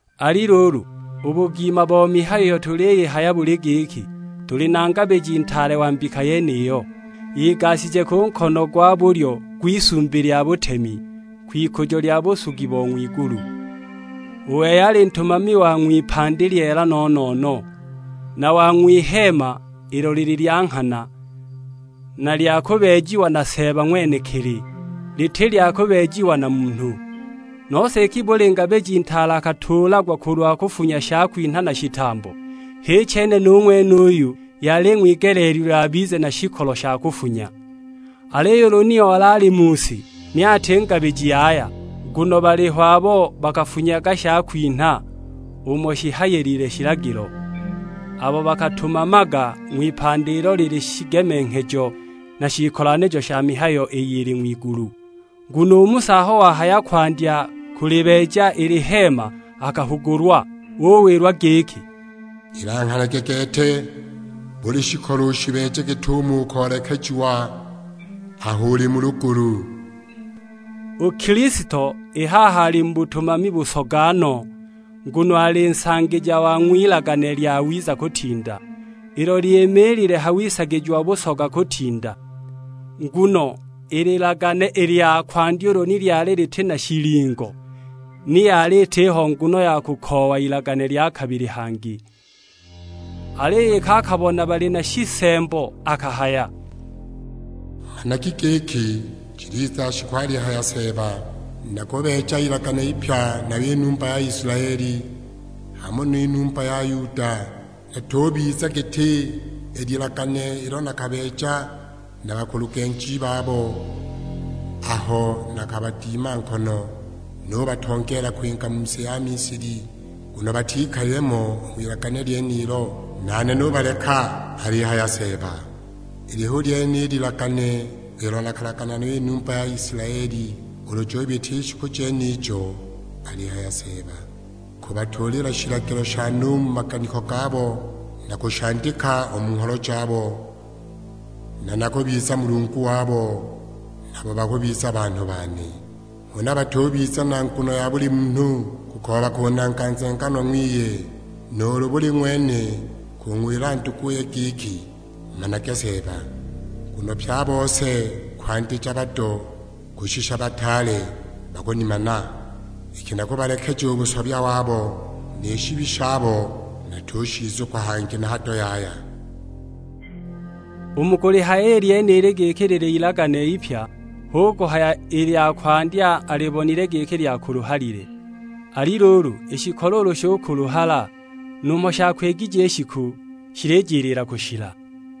Ali luulu, u bugima bo mihayo iyo tuliyihaya buli giki, tuli na Ngabiji Ntaale wa mbika yeniyo, igashije ku nkono gwa bulyo gw'isumbi lya butemi; kwikujo lya busugi bo ng'wigulu. U wei ali ntumami wa ng'wipandi lyeela no-no-no, na wa ng'wiheema ilo lili lya nghana, na lya kubeejiwa na Seeba ng'wenekili: liti lya kubeejiwa na munhu. Nose iki buli ngabiji ntaale akatuulagwa kulwa kufunya shakwinha na shitambo, h'i chene nu ng'wenuyu yali ing'wigeleelilwe abize na shikolo sha kufunya. Aliyo ulu ni ali mu si, ni ati ngabiji yaya, nguno baliho abo bakafunyaga shakwinha umo shihayilile shilagilo; abo bakatumamaga ng'wipandi ilo lili shigemenghejo na shiikolanijo sha mihayo iyo ili ng'wigulu. Nguno u Musa aho wahaya kwandya kulibeeja i liheema akahugulwa; uwilwa giki, "Ilanghanage gete, buli shikolo ushibeeje git'umo ukoolekejiwa aho uli mu lugulu." U Kilisto i haha ali mu butumami busoga no, nguno ali Nsangija wa ng'wilagane lyawiza kutinda, ilo lyimiilile ha wisagijiwa busoga kutinda. Nguno i lilagane i lya kwandya ulu ni lyali liti na shilingo, ni yali itiho nguno ya kukoowa ilagane lya kabili hangi. Aliyo iki akabona bali na shisembo akahaya, "Managi giki jiliza shiku, alihaya Seeba; nakubeeja ilagane ipya nayo i numba ya Isilaeli, hamo ni numba ya Yuda. Litubiza giti i lilagane ilo nakabeeja na bakulugenji babo aho nakabadima nkono nubatongeela kwinga mu si ya Misili; nguno batikalile mo u Ng'wilagane lyenilo, nane nubaleka; alihaya Seeba. Ili hu lyene i lilagane ilo nakulagana nayo i numba ya Isilaeli ulu jubita i shiku jenijo, alihaya Seeba, kubatuulila shilagilo shane u mu maganiko gabo; na kushandika u mu ngholo jabo, na nakubiza Mulungu wabo, nabo bakubiza banhu bane. Huna batubiza na nguno ya buli munhu kukooba kunanga nzenganwa ng'wiye; nuulu buli ng'wene kung'wila nduguye giki, 'Manage Seeba;' nguno pye a bose kwandija bado kushisha bataale, bakunimana. Iki nakubalekeja u busobya wabo, ni shibi shabo natushizukwa hangi na hado yaya." U mu kulihaya i lyenili giki lili ilagane ipya, hu kuhaya i lya kwandya alibonile giki lyakuluhalile. Ali luulu, i shikolo ulu shukuluhala numho shakwigije i shiku, shilijiliila kushila.